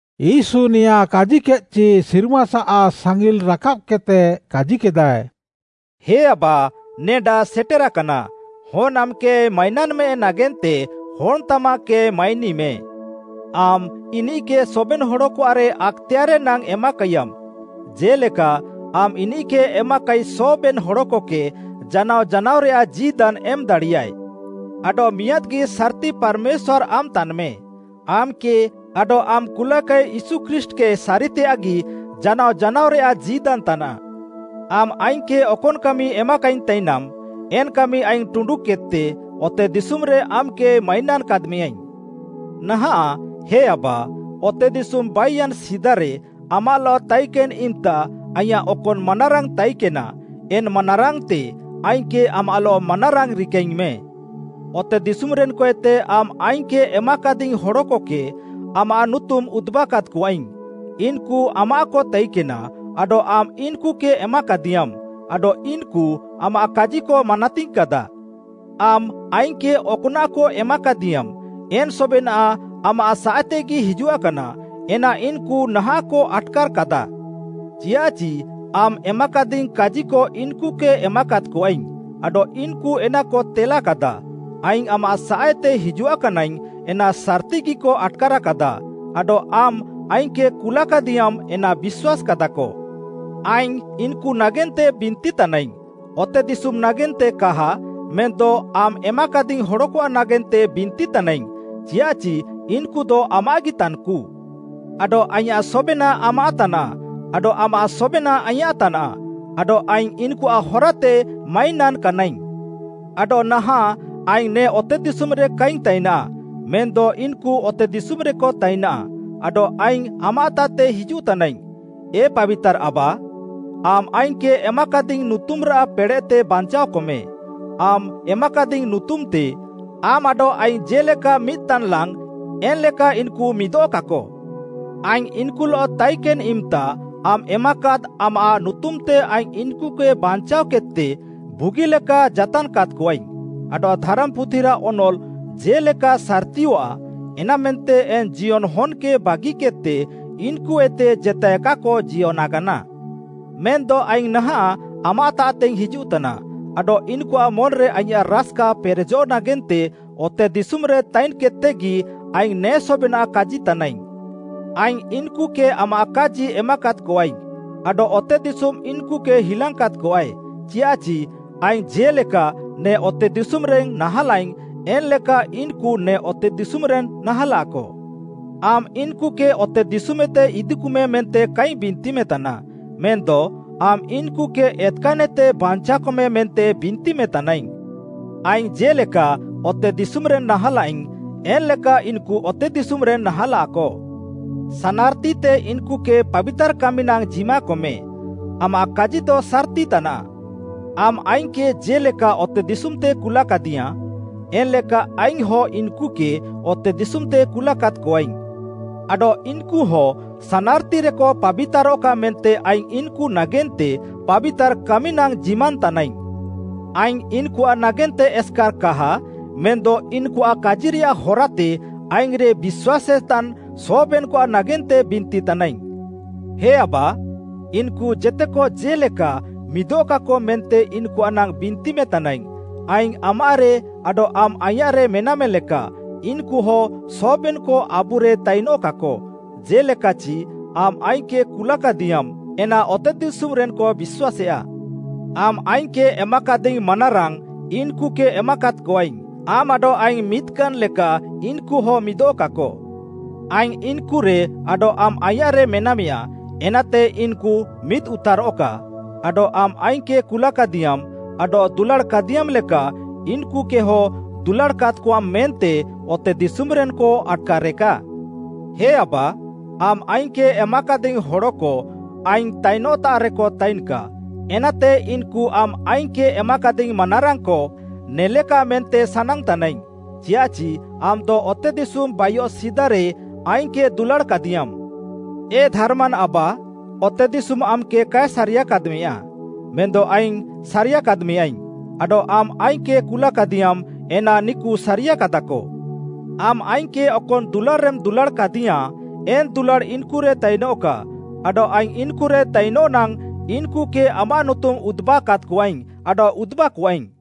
ୟୀଶୁ ନେଆଁଁ କାଜିକେଦ୍‌ଚି ସିର୍ମାସାଃ ସାଙ୍ଗିଲ୍‍ ରାକାବ୍‍କେଦ୍‍ତେ କାଜିକେଦାଃଏ, ହେ ଆବା ନେଡା ସେଟେରାକାନା, ହନ୍‌ ଆମ୍‌କେ ମାଇନାନ୍‌ମେ ନାଗେନ୍ତେ ହନ୍‍ତାମାଃକେ ମାଇନିମେ। ଆମ୍‌ ଇନିଃକେ ସବେନ୍‌ ହଡ଼କଆଃରେ ଆକ୍‌ତେୟାର୍‌ରେ ନାଙ୍ଗ୍‌ ଏମାକାଇୟାମ୍‌, ଜେ'ଲେକା ଆମ୍‌ ଇନିଃକେ ଏମାକାଇ ସବେନ୍‌ ହଡ଼କକେ ଜାନାଅ ଜାନାଅରେୟାଃ ଜୀଦାନ୍‌ ଏମ୍‌ଦାଡ଼ିୟାଃଏ। ଆଡଃ ମିଆଁଦ୍‌ଗି ସାର୍‌ତି ପାର୍‌ମେଶ୍ୱାର୍‌ ଆମ୍‌ ତାନ୍‌ମେ, ଆମ୍‌କେ ଆଡଃ ଆମ୍‌ କୁଲାକାଇ ୟୀଶୁ ଖ୍ରୀଷ୍ଟ୍‌କେ ସାରିତେୟାଃଗି ଜାନାଅ ଜାନାଅରେୟାଃ ଜୀଦାନ୍‌ ତାନାଃ। ଆମ୍‌ ଆଇଙ୍ଗ୍‌କେ ଅକନ୍‌ କାମି ଏମାକାଇଙ୍ଗ୍‌ ତାଇନାମ୍‌ ଏନ୍‌ କାମି ଆଇଙ୍ଗ୍‌ ଟୁଣ୍ଡୁକେଦ୍‌ତେ ଅତେଦିଶୁମ୍‌ରେ ଆମ୍‌କେ ମାଇନାନ୍‌ କାଦ୍‌ମେଁୟାଇଙ୍ଗ୍‌। ନାହାଁଃ, ହେ ଆବା, ଅତେଦିଶୁମ୍‌ ବାଇୟାନ୍‌ ସିଦାରେ ଆମାଃଲଃ ତାଇକେନ୍‌ ଇମ୍‌ତା ଆଇଁୟାଃ ଅକନ୍‌ ମାନାରାଙ୍ଗ୍‌ ତାଇକେନା ଏନ୍‌ ମାନାରାଙ୍ଗ୍‌ତେ ଆଇଙ୍ଗ୍‌କେ ଆମାଃଲଃ ମାନାରାଙ୍ଗ୍‌ ରିକାଇଙ୍ଗ୍‌ମେଁ। “ଅତେଦିଶୁମ୍‌ରେନ୍‍କଏତେ ଆମ୍‌ ଆଇଙ୍ଗ୍‌କେ ଏମାକାଦିଙ୍ଗ୍‌ ହଡ଼କକେ, ଆମାଃ ନୁତୁମ୍‌ ଉଦୁବାକାଦ୍‍କଆଇଙ୍ଗ୍‌, ଇନ୍‌କୁ ଆମାଃକ ତାଇକେନା ଆଡଃ ଆମ୍‌ ଇନ୍‌କୁକେ ଏମାକାଦିୟାଁମ୍‌ ଆଡଃ ଇନ୍‌କୁ ଆମାଃ କାଜିକ ମାନାତିଙ୍ଗାଁକାଦାଃ। ଆମ୍‌ ଆଇଙ୍ଗ୍‌କେ ଅକ୍‌ନାଃକ ଏମାକାଦିୟାଁମ୍‌ ଏନ୍‌ ସବେନାଃ ଆମାଃ ସାଃଏତେଗି ହିଜୁଆକାନା, ଏନା ଇନ୍‌କୁ ନାହାଃଁକ ଆଟ୍‌କାର୍‍କାଦାଃ। ଚିୟାଃଚି ଆମ୍‌ ଏମାକାଦିଙ୍ଗ୍‌ କାଜିକ ଇନ୍‌କୁକେ ଏମାକାଦ୍‍କଆଇଙ୍ଗ୍‌ ଆଡଃ ଇନ୍‌କୁ ଏନାକ ତେଲାକାଦାଃ; ଆଇଙ୍ଗ୍‌ ଆମାଃ ସାଃଏତେ ହିଜୁଆକାନାଇଙ୍ଗ୍‌ ଏନା ସାର୍‌ତିଗିକ ଆଟ୍‌କାର୍‍କାଦାଃ, ଆଡଃ ଆମ୍‌ ଆଇଙ୍ଗ୍‌କେ କୁଲାକାଦିୟାଁମ୍‌ ଏନା ବିଶ୍ୱାସ୍‌କାଦାଃକ। “ଆଇଙ୍ଗ୍‌ ଇନ୍‌କୁ ନାଗେନ୍ତେ ବିନ୍ତିତାନାଇଙ୍ଗ୍‌, ଅତେଦିଶୁମ୍‌ ନାଗେନ୍ତେ କାହା ମେନ୍‌ଦ ଆମ୍‌ ଏମାକାଦିଙ୍ଗ୍‌ ହଡ଼କଆଃ ନାଗେନ୍ତେ ବିନ୍ତିତାନାଇଙ୍ଗ୍‌, ଚିୟାଃଚି ଇନ୍‍କୁଦ ଅାମାଃଗି ତାନ୍‍କୁ। ଆଡଃ ଆଇଁୟାଃ ସବେନାଃ ଆମାଃ ତାନାଃ, ଆଡଃ ଆମାଃ ସବେନାଃ ଆଇଁୟାଃ ତାନାଃ, ଆଡଃ ଆଇଙ୍ଗ୍‌ ଇନ୍‌କୁଆଃ ହରାତେ ମାଇନାନ୍‌ କାନାଇଙ୍ଗ୍‌। ଆଡଃ ନାହାଁଃ ଆଇଙ୍ଗ୍‌ ନେ ଅତେଦିଶୁମ୍‌ରେ କାଇଙ୍ଗ୍‌ ତାଇନାଃ, ମେନ୍‌ଦ ଇନ୍‌କୁ ଅତେଦିଶୁମ୍‌ରେକ ତାଇନାଃ, ଆଡଃ ଆଇଙ୍ଗ୍‌ ଆମାଃତାଃତେ ହିଜୁଃତାନାଇଙ୍ଗ୍‌। ଏ ପାବିତାର୍‌ ଆବା! ଆମ୍‌ ଆଇଙ୍ଗ୍‌କେ ଏମାକାଦିଙ୍ଗ୍‌ ନୁତୁମ୍‌ରାଃ ପେଡ଼େଃତେ ବାଞ୍ଚାଅକମେ, ଆମ୍‌ ଏମାକାଦିଙ୍ଗ୍‌ ନୁତୁମ୍‌ତେ, ଆମ୍‌ ଆଡଃ ଆଇଙ୍ଗ୍‌ ଜେ'ଲେକା ମିଦ୍‌ତାନ୍‌ଲାଙ୍ଗ୍‌, ଏନ୍‌ଲେକା ଇନ୍‌କୁ ମିଦଃକାକ। ଆଇଙ୍ଗ୍‌ ଇନ୍‍କୁଲଃ ତାଇକେନ୍‌ ଇମ୍‌ତା ଆମ୍‌ ଏମାକାଦ୍‍ ଆମାଃ ନୁତୁମ୍‌ତେ ଆଇଙ୍ଗ୍‌ ଇନ୍‌କୁକେ ବାଞ୍ଚାଅକେଦ୍‌ତେ ବୁଗିଲେକା ଯାତାନ୍‌କାଦ୍‌କଆଇଙ୍ଗ୍‌, ଆଡଃ ଧାରାମ୍‌ପୁଥିରାଃ ଅନଲ୍‌ ଜେ'ଲେକା ସାର୍‌ତିୟଆଃ, ଏନାମେନ୍ତେ ଏନ୍‌ ଜିୟନଃ ହନ୍‌କେ ବାଗିକେଦ୍‌ତେ ଇନ୍‌କୁଏତେ ଜେତାଏ କାକ ଜିୟନାକାନା। ମେନ୍‌ଦ ଆଇଙ୍ଗ୍‌ ନାହାଁଃ ଆମାଃତାଃତେଇଙ୍ଗ୍‌ ହିଜୁଃତାନା ଆଡଃ ଇନ୍‌କୁଆଃ ମନ୍‌ରେ ଆଇଁୟାଃ ରାସ୍‌କା ପେରେଜଃ ନାଗେନ୍ତେ ଅତେଦିଶୁମ୍‌ରେ ତାଇନ୍‌କେଦ୍‌ତେଗି ଆଇଙ୍ଗ୍‌ ନେ ସବେନାଃ କାଜିତାନାଇଙ୍ଗ୍‌। ଆଇଙ୍ଗ୍‌ ଇନ୍‌କୁକେ ଆମାଃ କାଜି ଏମାକାଦ୍‌କଆଇଙ୍ଗ୍‌, ଆଡଃ ଅତେଦିଶୁମ୍‌ ଇନ୍‌କୁକେ ହିଲାଙ୍ଗ୍‌କାଦ୍‌କଆଏ, ଚିୟାଃଚି ଆଇଙ୍ଗ୍‌ ଜେ'ଲେକା ନେ ଅତେଦିଶୁମ୍‌ରେନ୍‌ ନାହାଁଲାଇଙ୍ଗ୍‌ ଏନ୍‌ଲେକା ଇନ୍‌କୁ ନେ ଅତେଦିଶୁମ୍‌ରେନ୍‌ ନାହାଁଲାକ। ଆମ୍‌ ଇନ୍‌କୁକେ ଅତେଦିଶୁମ୍‌ଏତେ ଇଦିକୁମେ ମେନ୍ତେ କାଇଙ୍ଗ୍‌ ବିନ୍ତିମେତାନା, ମେନ୍‌ଦ ଆମ୍‌ ଇନ୍‌କୁକେ ଏତ୍‌କାନ୍‌ଏତେ ବାଞ୍ଚାଅକମେ ମେନ୍ତେ ବିନ୍ତିମେତାନାଇଙ୍ଗ୍‌। ଆଇଙ୍ଗ୍‌ ଜେ'ଲେକା ଅତେଦିଶୁମ୍‌ରେନ୍‌ ନାହାଁଲାଇଙ୍ଗ୍‌ ଏନ୍‌ଲେକା ଇନ୍‌କୁ ଅତେଦିଶୁମ୍‌ରେନ୍‌ ନାହାଁଲାକ। ସାନାର୍‌ତିତେ ଇନ୍‌କୁକେ ପାବିତାର୍‌ କାମି ନାଙ୍ଗ୍‌ ଜିମାକମେ; ଆମାଃ କାଜିଦ ସାର୍‌ତି ତାନାଃ। ଆମ୍‌ ଆଇଙ୍ଗ୍‌କେ ଜେ'ଲେକା ଅତେଦିଶୁମ୍‍ତେମ୍‌ କୁଲ୍‍କାଦିୟାଁ, ଏନ୍‌ଲେକା ଆଇଙ୍ଗ୍‌ହଁ ଇନ୍‌କୁକେ ଅତେଦିଶୁମ୍‌ତେ କୁଲାକାଦ୍‌କଆଇଙ୍ଗ୍‌। ଆଡଃ ଇନ୍‌କୁ ହଁ ସାନାର୍‌ତିରେକ ପାବିତାରଃକା ମେନ୍ତେ ଆଇଙ୍ଗ୍‌ ଇନ୍‌କୁ ନାଗେନ୍ତେ ପାବିତାର୍‌ କାମି ନାଙ୍ଗ୍‌ ଜିମାନ୍‌ ତାନାଇଙ୍ଗ୍‌। “ଆଇଙ୍ଗ୍‌ ଇନ୍‌କୁଆଃ ନାଗେନ୍ତେ ଏସ୍‍କାର୍ କାହା ମେନ୍‌ଦ ଇନ୍‌କୁଆଃ କାଜିରେୟାଃ ହରାତେ ଆଇଙ୍ଗ୍‌ରେ ବିଶ୍ୱାସେତାନ୍‌ ସବେନ୍‌କଆଃ ନାଗେନ୍ତେ ବିନ୍ତିତାନାଇଙ୍ଗ୍‌। ହେ ଆବା! ଇନ୍‌କୁ ଜେତେକ ଜେ'ଲେକା ମିଦଃକାକ ମେନ୍ତେ ଇନ୍‌କୁଆଃ ନାଙ୍ଗ୍‌ ବିନ୍ତିମେତାନାଇଙ୍ଗ୍‌, ଆଇଙ୍ଗ୍‌ ଆମାଃରେ ଆଡଃ ଆମ୍‌ ଆଇଁୟାଃରେ ମେନାମେ ଲେକା, ଇନ୍‌କୁହ ସବେନ୍‌କ ଆବୁରେ ତାଇନଃକାକ, ଜେ'ଲେକାଚି ଆମ୍‌ ଆଇଙ୍ଗ୍‌କେ କୁଲାକାଦିୟାଁମ୍‌ ଏନା ଅତେଦିଶୁମ୍‌ରେନ୍‌କ ବିଶ୍ୱାସେୟା। ଆମ୍‌ ଆଇଙ୍ଗ୍‌କେ ଏମାକାଦିଙ୍ଗ୍‌ ମାନାରାଙ୍ଗ୍‌ ଇନ୍‌କୁକେ ଏମାକାଦ୍‌କଆଇଙ୍ଗ୍‌, ଆମ୍‌ ଆଡଃ ଆଇଙ୍ଗ୍‌ ମିଦ୍‌କାନ୍‌ ଲେକା ଇନ୍‌କୁହ ମିଦଃକାକ। ଆଇଙ୍ଗ୍‌ ଇନ୍‍କୁରେ ଆଡଃ ଆମ୍‌ ଆଇଁୟାଃରେ ମେନାମେୟା, ଏନାତେ ଇନ୍‌କୁ ମିଦ୍‌ ଉତାରଃକା ଆଡଃ ଆମ୍‌ ଆଇଙ୍ଗ୍‌କେ କୁଲାକାଦିୟାଁମ୍‌ ଆଡଃ ଦୁଲାଡ଼୍‌କାଦିୟାଁମ୍‌ ଲେକା ଇନ୍‌କୁକେହ ଦୁଲାଡ଼ାକାଦ୍‌କଆମ୍‌ ମେନ୍ତେ ଅତେଦିଶୁମ୍‌ରେନ୍‌କ ଆଟ୍‌କାରେକା। “ହେ ଆବା, ଆମ୍‌ ଆଇଙ୍ଗ୍‌କେ ଏମାକାଦିଙ୍ଗ୍‌ ହଡ଼କ ଆଇଙ୍ଗ୍‌ ତାଇନଃତାଃରେକ ତାଇନଃକା, ଏନାତେ ଇନ୍‌କୁ ଆମ୍‌ ଆଇଙ୍ଗ୍‌କେ ଏମାକାଦିଙ୍ଗ୍‌ ମାନାରାଙ୍ଗ୍‌କ ନେଲେକା ମେନ୍ତେ ସାନାଙ୍ଗ୍‌ତାନାଇଙ୍ଗ୍‌, ଚିୟାଃଚି ଆମ୍‌ଦ ଅତେଦିଶୁମ୍‌ ବାଇୟେ ସିଦାରେ ଆଇଙ୍ଗ୍‌କେ ଦୁଲାଡ଼୍‌କାଦିୟାଁମ୍‌। ଏ ଧାର୍‌ମାନ୍ ଆବା, ଅତେଦିଶୁମ୍‌ ଆମ୍‌କେ କାଏ ସାରିୟାକାଦ୍‌ମେୟା ମେନ୍‌ଦ ଆଇଙ୍ଗ୍‌ ସାରିୟାକାଦ୍‍ମେୟାଇଙ୍ଗ୍‌ ଆଡଃ ଆମ୍‌ ଆଇଙ୍ଗ୍‌କେ କୁଲାକାଦିୟାଁମ୍‌ ଏନା ନିକୁ ସାରିୟାକାଦାଃକ। ଆମ୍‌ ଆଇଙ୍ଗ୍‌କେ ଅକନ୍‌ ଦୁଲାଡ଼୍‌ରେମ୍‌ ଦୁଲାଡ଼୍‌କାଦିୟାଁ ଏନ୍‍ ଦୁଲାଡ଼୍‌ ଇନ୍‍କୁରେ ତାଇନଃକା, ଆଡଃ ଆଇଙ୍ଗ୍‌ ଇନ୍‍କୁରେ ତାଇନଃନାଙ୍ଗ୍‌ ଇନ୍‌କୁକେ ଆମାଃ ନୁତୁମ୍‌ ଉଦ୍‌ବାକାଦ୍‌କଆଇଙ୍ଗ୍‌ ଆଡଃ ଉଦୁବାକୁଆଇଙ୍ଗ୍‌।”